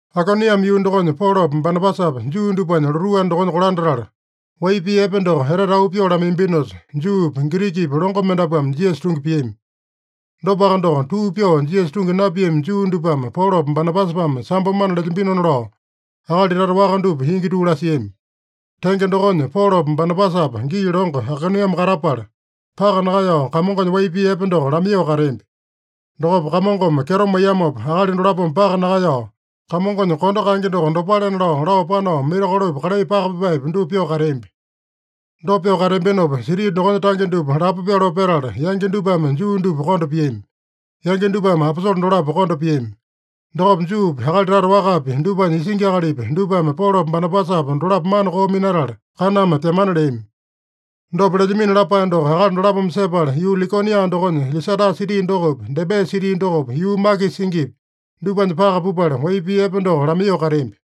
Aikoniame yuu dokonya Polopa Banabasapa Juu dupanya lotuu anda dokonya kolandatala, wai pii epe doko etete auu pyoo lamaiyambinosa, Juupi, Girikipi longo mendapuame Jisasa tungi piami. Dopaka doko, tuu pyoo Jisasa tungi napiami Juu dupame Polopa Banabasapame sambo mana lelyambinona lao akali tata waka dupa ingi tuu lasiami. Tenge dokonya, Polopa Banabasapa gii longo Aikoniame katapala, paka nakaeyao Kamongonya wai pii epe doko lamaiyoo kateambi. Dokopa Kamongome kyeto maiyamopa, akali dolapome paka nakaeyao, Kamongonya kondo kaenge doko dopalena lao, lao panao, mirakolopi, kalai paka pipaepi, dupa pyoo kateambi. Dopa pyoo kateambinopa, siti dokonya tange dupa lapo pyoloo petala, yangi dupame Juu dupa konda piami. Yangi dupame aposole dolapo konda piami. Dokopa Juupi, akali tata wakapi, dupanya isingi akalipi, dupame Polopa Banabasapa dolapo mana koo minatala, kaname pyamana leami. Dopa lelyamino lapae doko akali dolapome sepala, yuu Likonia dokonya Lisata siti dokopi, Debe siti dokopi, yuu makisa singipi, dupanya paka pupala, wai pii epe doko lamaiyoo kateambi.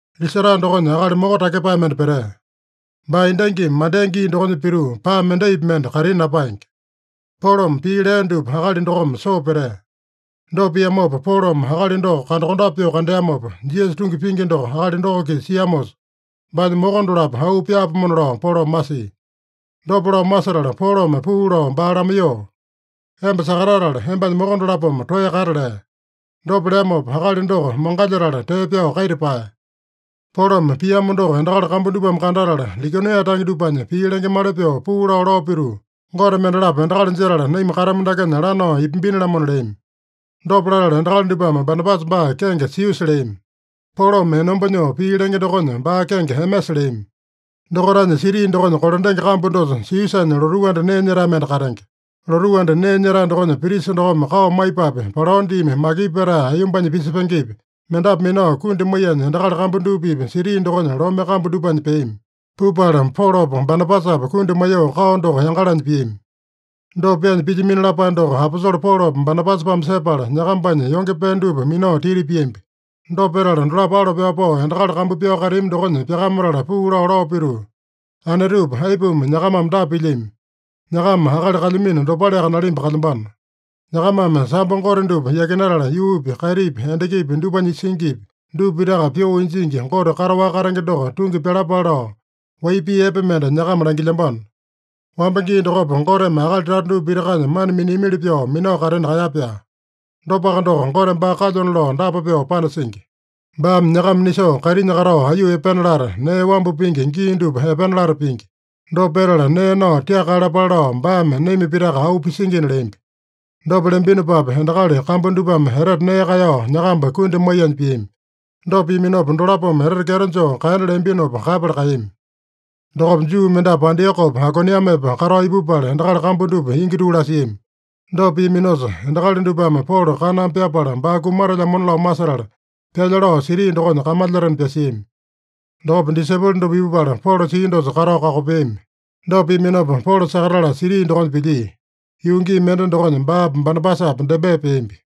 Lisata dokonya akali moko takyepae mende petea. Baa endangimi mandea gii dokonya pituu, paa mendaipi mende kaitini napaenge. Polome pii lea dupa akali dokome soo petea. Dopa piamopa, Polome akali doko kandakondape pyoo kandeamopa, Jisasa tungi pingi doko akali doko-kisa siamosa, baanya moko dolapo auu pyaapomona lao Polome masia. Dopa lao masetala Polome puu lao baa lamaiyoo, “Emba sakatatala, embanya moko dolapome toeya kata” lea. Dopa leamopa, akali doko mangalyetala tee pyao kaita paeya. Polome piamo doko endakali kambu dupame kandatala, Likonia tange dupanya pii lengemali pyoo puu lao, lao pituu, “Gote mendalapo endakali jetala, naima katamu dakenya lanao ipambini-lamona” leami. Dopa latala endakali dupame Banabasa baa kenge Siusa leami. Polome enomba nyoo pii lenge dokonya, baa kenge Emesa leami. Dokaitanya siti dokonya kolandenge kambu dosa Siusanya lotuu anda nee nyetae mende katenge. Lotuu anda nee nyetae dokonya prisa dokome kao maipapi, palao diimi makipu petae aiyombanya pisepengepi, mendapu minao, kundi maiyanya endakali kambu dupa-pipa siti dokonya lome kambu dupanya peami. Pupala Polopa Banabasapa kundi maiyoo kao doko yangalanya piami. Dopa pyaanya pilyamino lapae doko aposole Polopa Banabasapame sepala, nyakambanya yonge pee dupa minao titi piambi. Dopa petala dolapo alo pyao pao, endakali kambu pyao kateami dokonya pyakamatala puu lao, lao pituu, “Anetupa, aipuma nyakamame dapa pilyami? Nyakama akali kalyamino dopaleaka nalimba kalyambano. Nyakamame sambo gote dupa yakinatala, yuupi, kaitipi, endakipi, dupanya singipi, dupa pitaka pyoo injingi Gote kataowaka katenge doko tungi pyalapale lao, wai pii epe mende nyakama langilyambano. Wamba gii dokopa, Goteme akali tata dupa pitakanya mana miniamili pyoo minao katena kaeya-pyaa. Dopaka doko, Gote baa kalyona lao dapa pyoo panasingi: Baame nyakama nisoo, kaitinya katao aiyuu epena lata, nee wambu pingi gii dupa epena lata pingi. Dopa petala, nee nao tiaka kaeyalapale lao baame naima pitaka auu pisingina” leambi. Dopa leambinopapi, endakali kambu dupame etete nee kaeyao nyakamba kundi maiyanya piami. Dopa piaminopa, dolapome etete kyeto joo kaena leambinopa kaeyapala kaeyami. Dokopa Juu mendapu Antiokopa, Aikoniamepa katao ipupala, endakali kambu dupa ingi tuu lasiami. Dopa piaminosa, endakali dupame Polo kaname pyapala, baa kumatelyamona lao masetala, pyalya lao siti dokonya kamalyatena pyasiami. Dokopa disaipolo dupa ipupala, Polo sia dosa katao kakopeami. Dopa piaminopa, Polo sakatatala siti dokonya pilyia. Yuu gii mende dokonya baapa Banabasapa Debe peambi.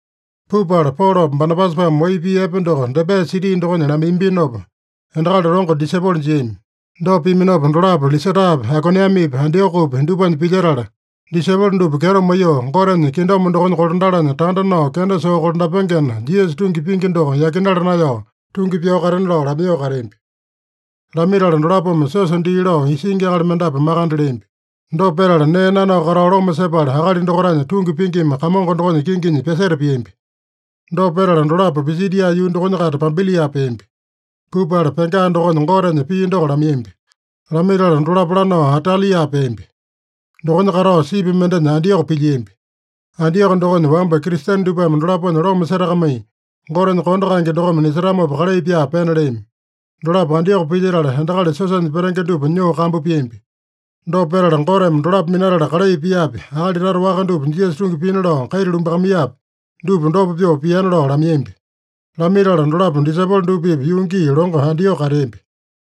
Pupala Polopa Banabasapame wai pii epe doko Debe siti dokonya lamaiyambinopa, endakali longo disaipolo jiami. Dopa piaminopa, dolapo Lisatapi, Aikoniamepi, Antiokopi dupanya pilyetala, disaipolo dupa kyeto maiyoo, Gotenya kingdom dokonya kolandalanya tanda nao kenda soo kolandapengena, Jisasa tungi pingi doko yakinala naeyao, tungi pyao katena lao lamaiyoo kateambi. Lamaitala dolapome siosa dii lao isingi akali mendapu makande leambi. Dopa petala, nee nanao katao loma sepala, akali dokaitanya tungi pingima Kamongo dokonya kinginya pyaseta piambi. Dopa petala dolapo Pisidia yuu dokonya-kaita Pampilia peambi. Pupala Pega dokonya Gotenya pii doko lamaiyambi. Lamaitala dolapo lanao Atalia peambi. Dokonya katao, sipi mendenya Antioko pilyiambi. Antioko dokonya wamba Kristene dupame dolaponya loma setakamai, Gotenya kondo kaenge dokome nisetamopa kalai pyaa pena leami. Dolapo Antioko pilyetala, endakali siosanya petenge dupa nyoo kambu piambi. Dopa petala, Goteme dolapo minatala kalai piapi, akali tata waka dupa Jisasa tungi pina lao kaita lumbakamaiyapi, dupa dopa pyoo piana lao lamaiyambi. Lamaitala dolapo disaipolo dupa-pipa yuu gii longo Antioko kateambi.